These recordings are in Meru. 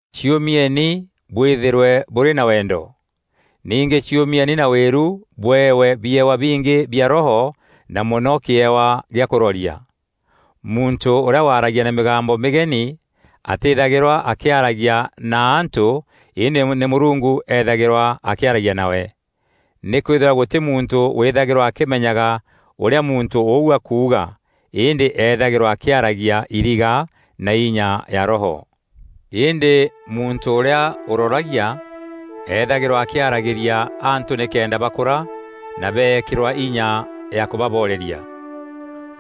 Ciûmieni bwîthîrwe bûrî na wendo. Ningî ciûmieni na wîru bûewe biewa bingî bia Roho na mono kîewa gîa kûroria. Muntû ûrîa waragia na mîgambo mîgeni atîîthagîrwa akîaragia na antû îndî nî Mûrungu ethagîrwa akîaragia nawe. Nîkwîthîrwa gûtî muntû wîthagîrwa akîmenyaga ûrîa muntû ûu akuuga îndî ethagîrwa akîaragia iriga na inya ya Roho. Îndî muntû ûrîa ûroragia ethagîrwa akîaragîria antû nîkenda bakûra na beekîrwa inya na kûbaboreria.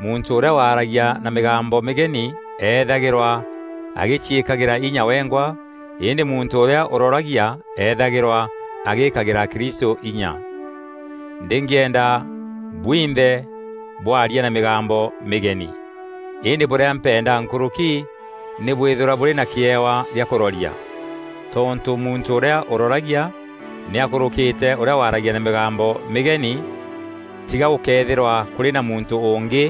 Muntû ûrîa waragia na mîgambo mîgeni ethagîrwa agîciîkagîra inya wengwa îndî muntû ûrîa ûroragia ethagîrwa agîkagîra akristû inya. Ndîngîenda bwinthe bwaria na mîgambo mîgeni, îndî bûrîa mpenda nkûrûki nî bwîthîrwa bûrî na kîewa gîa kûroria. Tontû muntû ûrîa ûroragia nî akûrûkîte ûrîa waragia na mîgambo mîgeni, tiga gûkëethîra kûrî na muntû ûngî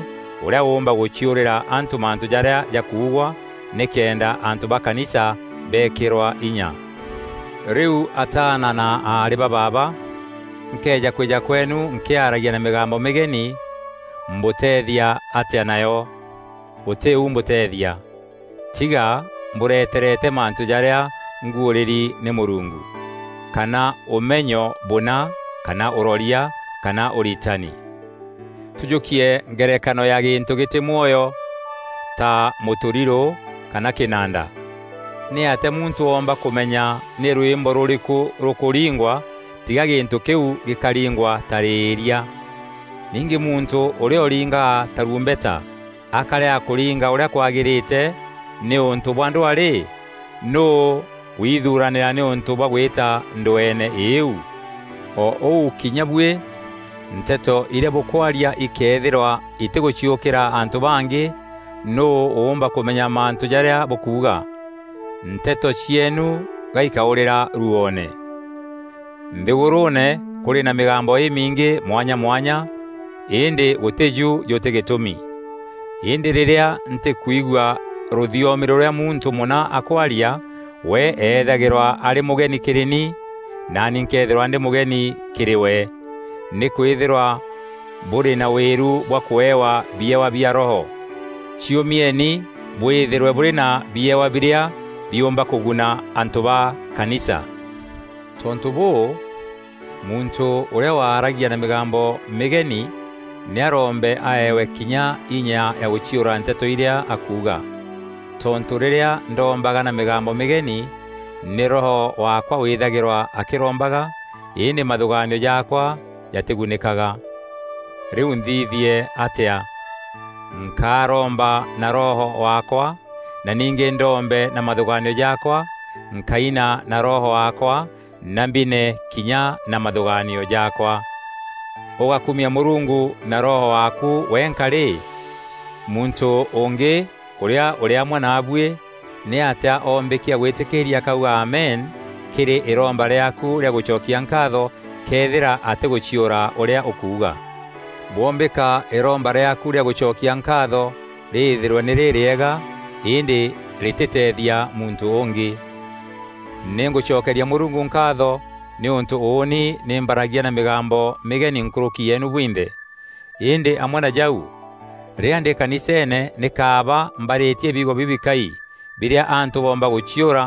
ûrîa ûûmba gûciûrîra antû mantû jarîa jakuugwa, nîkenda antû ba kanisa beekîrwa inya. Rîu ataana na aarî ba baaba, nkëeja kwîja kweenû nkîaragia na mîgambo mîgeni, mbûteethia atîa nayo? Gûtî u mbûteethia, tiga mbûreterete mantû jarîa nguûrîri nî Mûrungu, kana ûmenyo bûna kana ûroria kana ûritani. Tûjûkie ngerekano ya gîntû gîtî mwoyo ta mûtûrirû kana kînanda: nîatîa muntû oomba kûmenya nî rwîmbo rûrîkû rûkûringwa tiga gîntû kîu gîkaringwa tarîîria? Ningî muntû ûrîa ûringaga tarumbeta akärega kûringa ûrîa kwagîrîte nîûntû bwa ndwaa rî, nûû withuranîra nîûntû bwa gwîta ndweene îuu? O ûu kinya buî nteto irîa bûkwaria ikëethîrwa itîgûciûkîra antû bangî, nûû ûûmba kûmenya mantû jarîa bûkuuga? Nteto cieenu ga ikaûrîra ruoone. Nthîgûrûûne kûrî na mîgambo îmingî mwanya mwanya, îndî gûtîju jutî gîtûmi. Îndî rîrîa ntîkwigua rûthiomi rûrîa muntû mûna akwaria, we ethagîrwa arî mûgeni kîrî ni naani nkeethîrwa ndî mûgeni kîrî we. Nîkwîthîrwa bûrî na wîru bwa kûewa biewa bia Roho, ciûmieni bwîthîrwe bûrî na biewa birîa biûmba kûguna antû ba kanisa. Tontû bûû, muntû ûrîa waragia na mîgambo mîgeni, nî arombe aewe kinya inya ya gûciûra nteto irîa akuuga. Tontû rîrîa ndombaga na mîgambo mîgeni, nî roho waakwa wîthagîrwa akîrombaga, îndî mathûgaanio jaakwa jatîgunîkaga. Rîu nthithie atîa? Nkaromba na roho waakwa, na ningî ndombe na mathûgaanio jaakwa; nkaina na roho waakwa na mbine kinya na mathûgaanio jaakwa. Ûgäkumia Mûrungu na roho waaku wenka rî, muntû ûngî ûrîa ûrî amwe naabuî nîatîa oombîkia gwîtîkîîria akauga, “Amen” kîrî îromba rîaaku rîa gûcokia nkaatho këethîra atîgûciûra ûrîa ûkuuga? Bwombîka îromba rîaaku rîa gûcokia nkaatho rîîthîrwe nî rîrîega, îndî rîtîteethia muntû ûngî. Nî ngûcokeria Mûrungu nkaatho nîûntû ûûni nî mbaragia na mîgambo mîgeni nkûrûki yeenu bwinthe. Îndî amwe na jau, rîrîa ndî kaniseene nî kaaba mbarîtie biugo bibikai birîa antû boomba gûciûra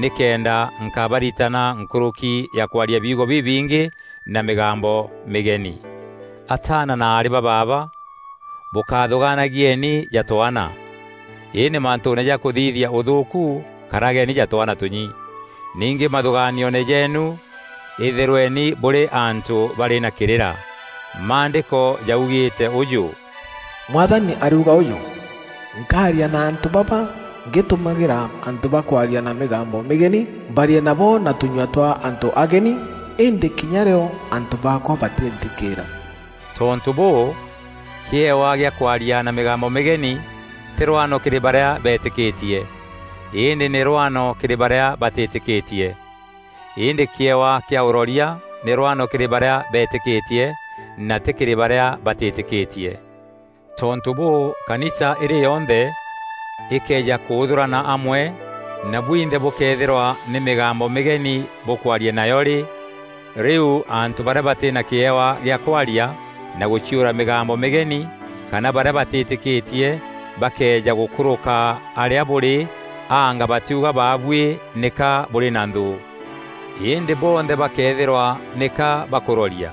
nîkenda nkabaritana nkûrûki ya kwaria biugo bibingî na mîgambo mîgeni. Ataana na aarî ba baaba, bûkáthûgaanagieni ja twaana, îndî mantûûne ja kûthithia ûthûûku, karageni ja twaana tûnyi. Ningî mathûgaanioone jeenu îthîrweni bûrî antû barî na kîrîra. Maandîko jaugîîte ûjû: “Mwathani ariuga ûjû, ‘Nkaaria na antû baba, ngîtumagîra antû bakwaria na mîgambo mîgeni, mbarie nabo na tûnyua twa antû ageni, îndî kinya rîo antû baakwa, batînthikîîra.’” Tontû bûû, kîewa gîa kwaria na mîgambo mîgeni tî rwano kîrî barîa beetîkîtie, îndî nî rwano kîrî barîa batîtîkîtie; îndî kîewa kîa ûroria nî rwano kîrî barîa beetîkîtie na tî kîrî barîa batîtîkîtie. Tontû bûû kanisa îrî yonthe îkeeja kûûthûrana amwe na bwinthe bûkëethîrwa nî mîgambo mîgeni bûkwaria nayo rî, rîu antû barîa batî na kîewa gîa kwaria na gûciûra mîgambo mîgeni kana barîa batîtîkîtie bakëeja gûkûrûka arîa bûrî anga batiuga baabuî nîka burî na nthû? Îndî bonthe bakëethîrwa nîka bakûroria,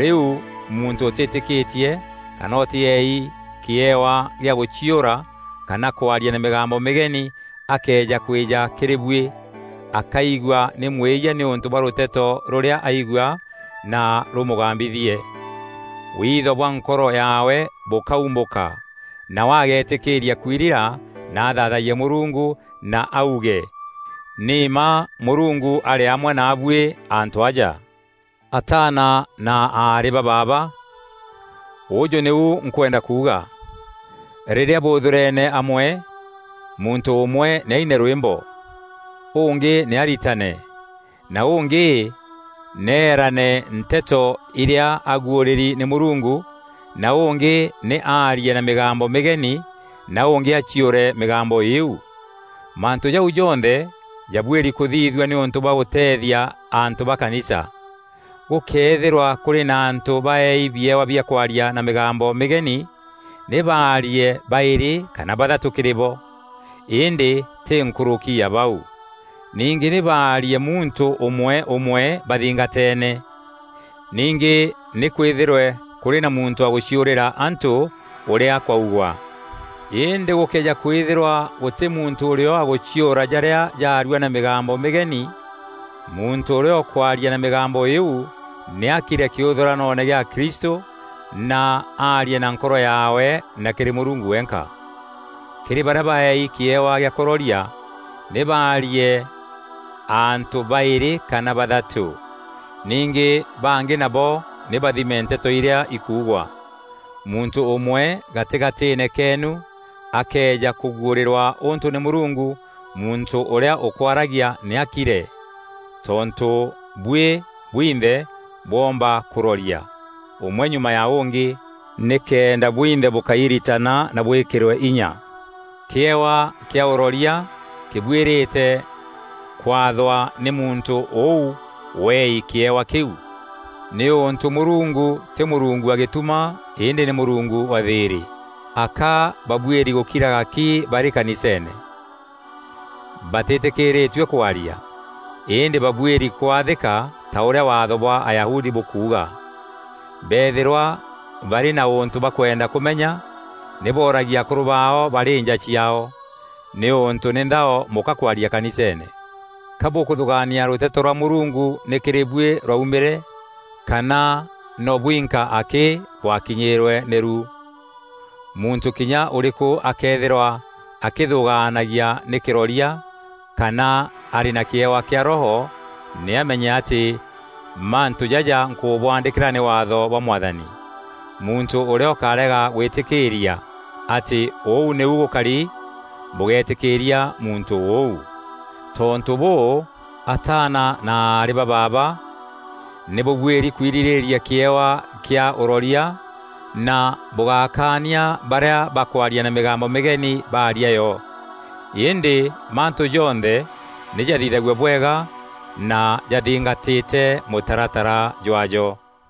rîu muntû ûtîtîkîtie kana ûtîeei kîewa gîa gûciûra kana kwaria na mîgambo mîgeni akëeja kwîja kîrî buî, akaigua nî mwîyia nîûntû bwa rûteto rûrîa aigua na rûmûgambithie. Witho bwa nkoro yaawe bûkaûmbûka nawe agetîkîîria kwirira na athathayie Mûrungu na auge “Ni mma Mûrungu arî amwe naabuî antû aja!” Ataana na aarî ba baaba, ûjû nîu nkweenda kuuga: rîrîa bûûthûrene amwe, muntû ûmwe nî aine rwîmbo, ûngî nî aritane, na ûngî nî eeraane nteto irîa aguûrîri nî Mûrungu, na ûngî nî arie na mîgambo mîgeni na ûngî aciûre mîgambo îîu. Mantû jau jonthe jabuîri kûthithua nîûntû bwa gûteethia antû ba kanisa. Gûkëethîrwa kûrî na antû baeei biewa bia kwaria na mîgambo mîgeni, nî baarie baîrî kana bathatû kîrî bo. Îndî tî nkûrûki ya bau. Ningî nî baarie muntû ûmwe ûmwe bathingateene. Ningî nî kwîthîrwe kûrî na muntû wa gûciûrîra antû ûrîa kwaugwa. Îndî gûkëeja kwîthîrwa gûtî muntû ûrîo wa gûciûra jarîa jaarua na mîgambo mîgeni, muntû ûrîa ûkwaaria na mîgambo îîu nî akire kîûthûranoone gîa akristû, na arie na nkoro yaawe na kîrî Mûrungu wenka. Kîrî barîa baeei kîewa gîa kûroria, nî baarie antû baîrî kana bathatû. Ningî bangî nabo nî bathime nteto irîa ikuugwa. Muntû ûmwe gatîgatîîne keenu akëeja kûguûrîrua ûntû nî Mûrungu, muntû ûrîa ûkwaragia nî akire. Tontû buî bwinthe bwoomba kûroria, ûmwe nyuma ya ûngî, nîkenda bwinthe bûkairitana na bwîkîrwe inya. Kîewa gîa ûroria kîbuîrîte kwathwa nî muntû ûu weei kîewa kîu, nîûntû Mûrungu tî Mûrungu wa gîtuma îndî nî Mûrungu wa thîîrî. Aka babuîri gûkiraga ki barî kaniseene. Batîtîkîrîtue kwaria, îndî babuîri kwathîka ta ûrîa waatho bwa Ayahudi bûkuuga. Beethîrwa barî na ûntû bakwenda kûmenya, nî booragie akûrû baao barî nja ciaao, nîûntû nî nthao mûka kwaria kaniseene. Ka bûkûthûgaania rûteto rwa Mûrungu nî kîrî buî rwaumîre, kana no bwinka akî bwakinyîîrwe nî rû? Muntû kinya ûrîkû akëethîrwa akîthûgaanagia nî kîroria kana arî na kîewa kîa Roho, nî amenye atî mantû jaja nkûbwaandîkîra nî Waatho bwa Mwathani. Muntû ûrîa ûkarega gwîtîkîîria atî ûu nîu gûkari, bûgeetîkîîria muntû ûu. Tontû bûû, ataana na aarî ba baaba, nî bûbuîri kwirîrîîria kîewa kîa ûroria na bûgákania barîa bakwaria na mîgambo mîgeni baaria yo. Îndî mantû jonthe nî jathithague bwega na jathingatîte mûtaratara jwaajo.